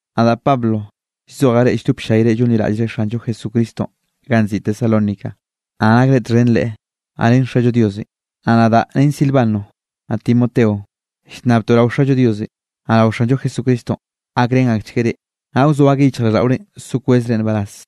Nadaꞌ Pablo llzojaꞌ reꞌ lldop ll-llayre llonliraꞌllre Xanllo Jesucristonꞌ ganꞌ nziꞌi Tesalónica, naꞌ nakre txhen Leꞌe, naꞌ ren Xallo Diosenꞌ. Naꞌ nadaꞌ ren Silvano, naꞌ Timoteo, llnnabtoꞌ rao Xallo Diosenꞌ, naꞌ rao Xanllo Jesucristonꞌ gakrén akchgueꞌ reꞌ, naꞌ wzoa akeꞌ yichjraꞌlldaꞌorenꞌ so kwezre nbaraz.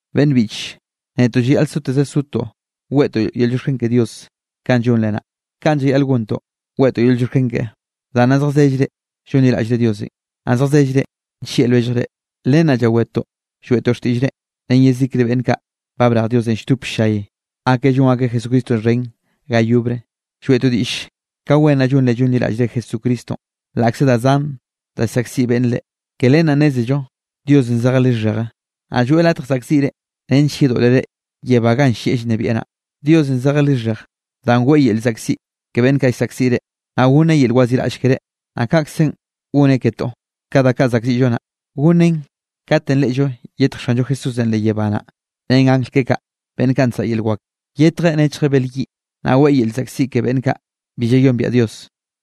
Beꞌnn biꞌche, netoꞌ llayaꞌl soteze sotoꞌ, weꞌtoꞌ yel llioxken ke Dios kanꞌ llonre naꞌ. Kaꞌn llayaꞌl gontoꞌ weꞌtoꞌ yel llioxken keꞌe, danꞌ nna zjazellre llonliraꞌllre Diosenꞌ, naꞌ zjazellre nllieꞌ lwelljre. Len naꞌ llawetoꞌ lloeꞌtoꞌ xtiꞌllrenꞌ ren yezikre beꞌnn kaꞌ ba brej Diosenꞌ lldop ll-llay akeꞌ llon akeꞌ Jesucristonꞌ xhen ga yobre. Lloeꞌtoꞌ diꞌll ka wen naꞌ llonre llonliraꞌllre Jesucristonꞌ, laꞌkze da zan da llsaꞌkziꞌ beꞌnn reꞌ. Ke len naꞌ nnézello Diosenꞌ zejeꞌ lixheje, naꞌ lloeꞌ latj saꞌkziꞌre nench yedoꞌlere yebá ganꞌ llieꞌ llnebieꞌ naꞌ. Diosenꞌ zejeꞌ lixhej danꞌ weꞌe yel llzaꞌkziꞌ ke beꞌnn kaꞌ llsaꞌkziꞌ reꞌ, naꞌ gonneꞌ yel waziꞌraꞌll keré, naꞌ kaꞌkzenꞌ gonneꞌ ketoꞌ, ka da kaꞌ zaꞌkziꞌllo nnaꞌ. Gonneꞌn katenꞌ reꞌllo yetj Xanllo Jesúsenꞌ leꞌ yebá naꞌ, ren angl keꞌe kaꞌ, beꞌnn kaꞌ nsaꞌa yel wak. Yetjeꞌ nechjeꞌ bel yiꞌ. Naꞌ weꞌe yel llzaꞌkziꞌ ke beꞌnn kaꞌ bi llayombiaꞌ Dios,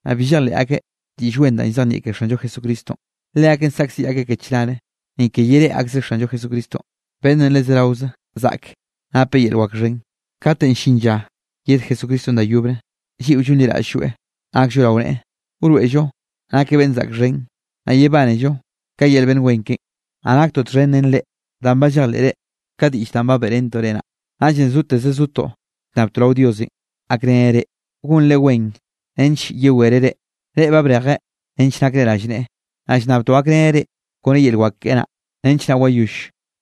naꞌ bi llejleꞌ akeꞌ Diꞌll Wen danꞌ llzejnieꞌ ke Xanllo Jesucristonꞌ. Leakeꞌn saꞌkziꞌ akeꞌ ke chnare, ni ke yereꞌe akzreꞌ Xanllo Jesucristo, beꞌnnenꞌ le zeraoze zaꞌke napeꞌ yel wak xhen. Katenꞌ llin lla yed Jesucristonꞌ da yobre, lliꞌo llonliraꞌll-lloeꞌ nakllo rao neꞌe, wroeꞌllo nakeꞌ beꞌnn zaꞌk xhen, naꞌ yebánello ka yel beꞌnn wen keꞌen. Naꞌ naktoꞌ txhen ren reꞌ, danꞌ ba llejleꞌre ka diꞌll danꞌ ba beꞌrentoꞌ reꞌ naꞌ. Naꞌllenꞌ zoteze zotoꞌ llnnabtoꞌ rao Diosenꞌ gakreneꞌ reꞌ, gonre wen nench yewereꞌ reꞌ, reꞌ ba brejeꞌ nench nakre rallneꞌe. Naꞌ llnnabtoꞌ gakreneꞌ reꞌ kone yel wak keꞌe naꞌ, nench naꞌ wayoll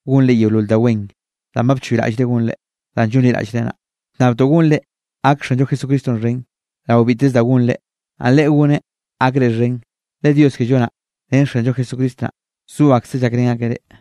gonre yeolol da wen danꞌ ba bchoyraꞌllre gonre, danꞌ llonliraꞌllre naꞌ. Llnnabtoꞌ gonre gak Xanllo Jesucristonꞌ xhen, rao biteze da gonre, naꞌ Leꞌe goneꞌ gakre xhen, le Dios kello naꞌ, ren Xanllo Jesucristo naꞌ, zo akseꞌ llakrén akeꞌ reꞌ.